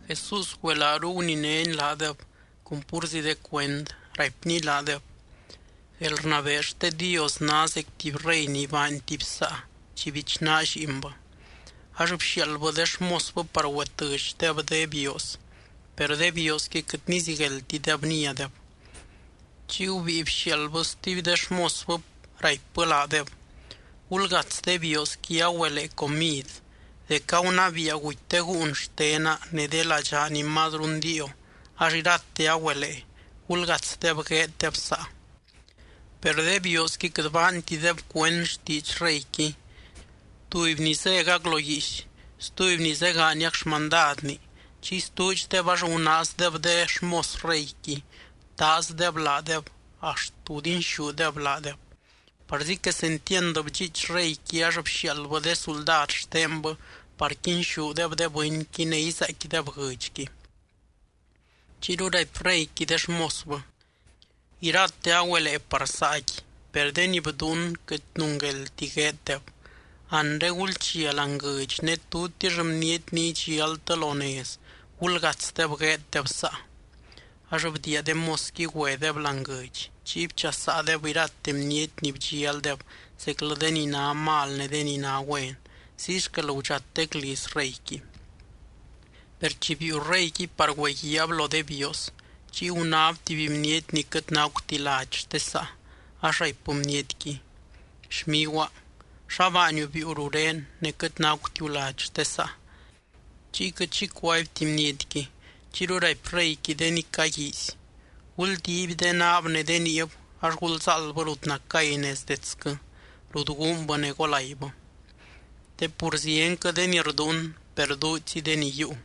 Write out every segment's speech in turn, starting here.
Jesús güelaaru guninény laadeb cun púrzi de cuend, raipny laadeb: —Guelrnabee xte Dios ná zec tuby rey ni baany tuby saa chi bichnaa lliinbɨ. Ax bxiaaldbɨ de xmosbɨ par güetɨdxdeb de bioos, per de bioosqui quɨt nizigueldtideb niadeb. Chiy gubíi bxiaaldbɨ stuby de xmosbɨ, raipbɨ laadeb: “Gulgats de bioosqui agüelee comid, dec gunabiia guty de gúun xtena ne de ladxaa ni mazru ndiio ax irate agüelee, gulgatsdeb gueeddeb saa.” Per de bioosqui quɨt baantideb cuend xtiidx reyqui. Tuby ni zégac lo guiix, stuby ni zégaaniac xmandadni, chiy stuudxdeb ax gunaazdeb de xmos reyqui btaazdeb laadeb axt gudinxúdeb laadeb. Parzi quesentiand bdxiich reyqui ax bxiaaldbɨ de suldad xtenbɨ par quinxúdeb de bɨnqui ne izaaicquideb guɨdxqui. Chiyru raipy reyqui de xmosbɨ: “Irate agüelee par saaqui, per de ni bduun quɨt nungueldti gueeddeb. Anre gulchia láani guɨdx ne tutix bniety ni idxialtɨ lo nez gulgatsdeb gueeddeb saa.” Ax bdiia de mosqui güedeb láani guɨdx, chiy bchasaadeb irate bniety ni bdxialdeb zeclɨ de ni ná mal ne de ni ná güen. Ziy xquel gudxatec liz reyqui. ’Per chi biiu reyqui par güeguiaab lo de bioos, chiy gunáb tuby bniety ni quɨt nacuti lady xte saa. Ax raipbɨ bnietqui: “Xmiguaa, ¿xa baaniu biiu ruré ne quɨt nacutiu lady xte saa?” Chiy quɨt xi cuaibti bnietqui. Chiyru raipy reyqui de ni caguiizy: “Guldiiby de naab ne de niib ax gulzáaldbɨ rut nacay nez detsquɨ, rut guunbɨ ne golaibɨ.” Te pur zienquɨ de ni rduun, per duudxzi de ni yiiu.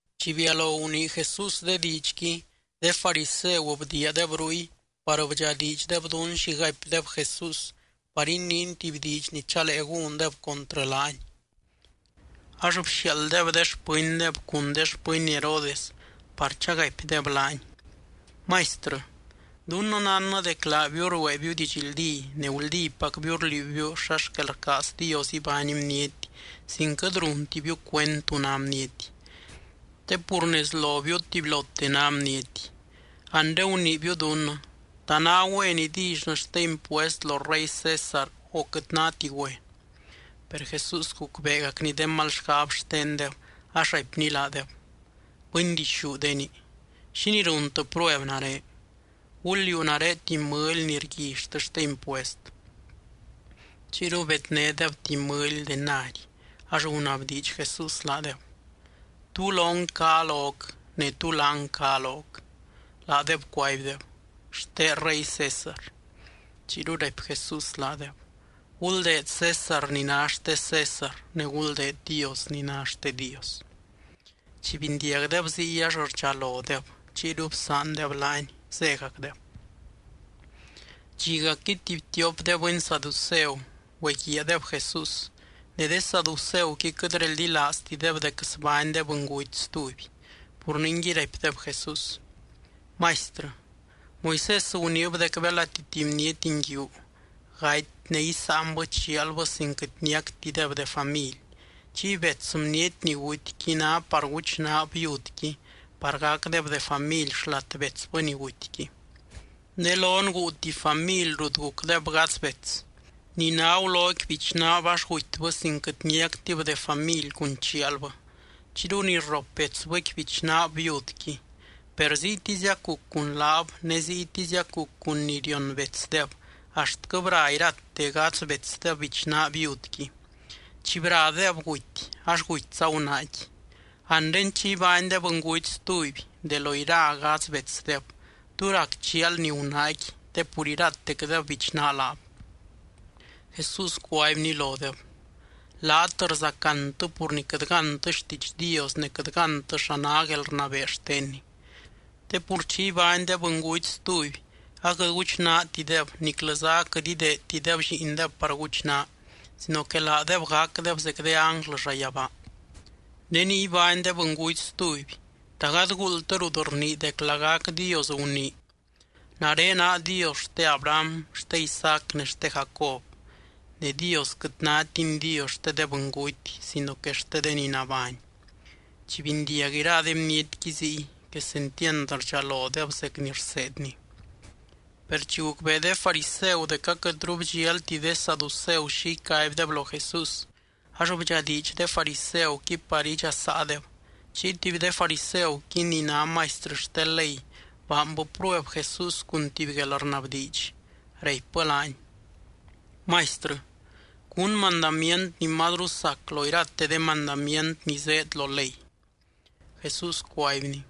Chi bialo gunii Jesús de diidxqui, de fariseu bdiiadeb ruy par bdxadiidxdeb dún xi gaipdeb Jesús par iniiny tuby diidx ni chalee gúndeb contrɨ laany. Ax bxiaalddeb de xpɨndeb cun de xpɨny Herodes par chagaipdeb laany: —Maistrɨ, dunnɨ nánnɨ dec laabiu rueebiu didxldí, ne guldípacbiu rliuubiu xa xquel rcaaz Dios ibány bniety, sin quɨt runtibiu cuend tú ná bniety. Te pur nez lobiu tubylote ná bniety. Anre guniibiu dunnɨ: ¿Ta ná güen idillynɨ xte impuest lo rey César, o quɨt náti güen? Per Jesús gucbeegacny de mal xgab xtendeb, ax raipny laadeb: —Bɨndixúdeni, ¿xínii runtɨ prueb nare? Gul liuu nare tuby mɨly ni rguillytɨ xte impuest. Chiyru bednédeb tuby mɨly denari, ax gunabdiidx Jesús laadeb: —¿Tú lon cá loc, ne tú láng cá loc? Laadeb cuaibdeb: —Xte rey César. Chiyru raipy Jesús laadeb: —Guldeed César ni ná xte César, ne guldeed Dios ni ná xte Dios. Chi bindiagdeb ziy, ax rdxalodeb, chiyru bsaandeb laany, zégacdeb. Dxigacqui tuby tiop de bɨny saduceu güeguiaadeb Jesús. Ne de saduceuqui quɨt reldilaaztideb dec sbány de bɨnguty stuby. Pur ningui raipdeb Jesús: —Maistrɨ, Moisés guniib dec belati tuby bniety nguiu gaty ne isáanbɨ chialbɨ sin quɨt niactideb de family, chiy bets bniety ni gutyqui ná par guchnaab viudqui par gacdeb de family xlat betsbɨ ni gutyqui. Ne lon guu tuby family rut gucdeb gadz bets. Ni ná guloqui bichnaab ax gutybɨ sin quɨt niactib de family cun chialbɨ, chiyru ni rrop betsbɨqui bichnaab viudqui. Per ziytiziac guc cun laab ne ziytiziac guc cun ni rion betsdeb, axtquɨ bra irate gadz betsdeb bichnaa viudqui. Chi bradeb guty ax gutyza gunaaqui. Anre chi ibány de bɨnguty stuby, de lo ira gadz betsdeb, ¿tú rac chialni gunaaqui te pur iratecdeb bichnaa laab? Jesús cuaibny lodeb: —Laat rzacantɨ pur ni quɨt gántɨ xtiidx Dios ne quɨt gántɨ xa ná guelrnabee xtenny. Te pur chi ibány de bɨnguty stuby, aquɨt guchnaatideb niclɨza aquɨt ideedtideb lliindeb par guchnaa, sino que laadeb gacdeb zec de ánglɨ llayabaa. Ne ni ibány de bɨnguty stuby, ¿ta gady guuldtɨ rut rnii dec lagac Dios gunii: “Nare naa Dios xte Abraham, xte Isaac ne xte Jacob”? Ne Dios quɨt nátiny Dios xte de bɨnguty, sino que xte de ni nabány. Chi bindiag ira de bnietqui ziy, quesentiand rdxalodeb zec ni rseedny. Per chi gucbee de fariseu dec aquɨtru bdxialti de saduceu xi icaibdeb lo Jesús, ax bdxadiidx de fariseuqui par idxasaadeb. Chiy tuby de fariseuqui ni ná maistrɨ xte ley baanbɨ prueb Jesús cun tuby guelrnabdiidx, raipbɨ laany: —Maistrɨ, ¿cún mandamient ni mazru sac lo irate de mandamient ni zéed lo ley? Jesús cuaibny: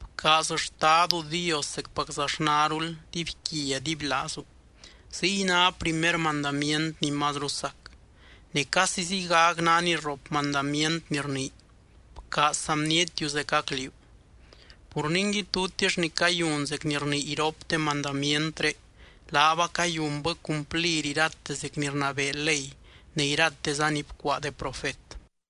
—“Bcaaz Xtadu Dios zecpaczaxnarul dibyquia dibylaazu.” Ziy ná primer mandamient ni mazru sac. Ne casi ziygac ná ni rrop mandamient ni rnii: “Bcaaz saa bnietiu zecac liú.” Pur ningui, tutix ni cayun zec ni rnii iropte mandamientré, laab acayunbɨ cumplir irate zec ni rnabee ley ne irateza ni bcuaa de profet.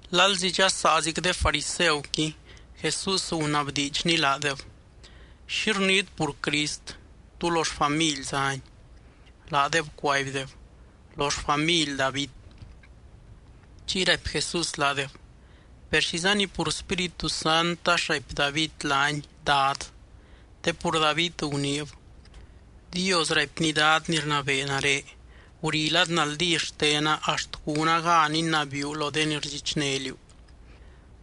Lalzi dxasaazic de fariseuqui, Jesús gunabdiidxny laadeb: —¿Xi rniit pur Crist? ¿Tú lo xfamily zány? Laadeb cuaibdeb: —Lo xfamily David. Chiy raipy Jesús laadeb: —Per, ¿xizani pur Spíritu Sant ax raipy David laany, Dad? Te pur David guniib: Dios raipny Dad ni rnabee nare: “Guri lad naldí xtena axt gúna gan inabiiu lo de ni rdxichné liú.”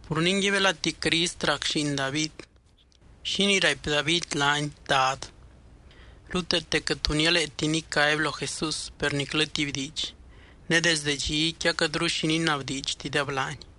Pur ningui, belati Crist rac lliin David, ¿xínii raipy David laany, Dad? Ruteete quɨt tu nialeeti nicaby lo Jesús, per niclɨ tuby diidx. Ne desde dxiqui aquɨtru xi ninabdiidxtideb laany.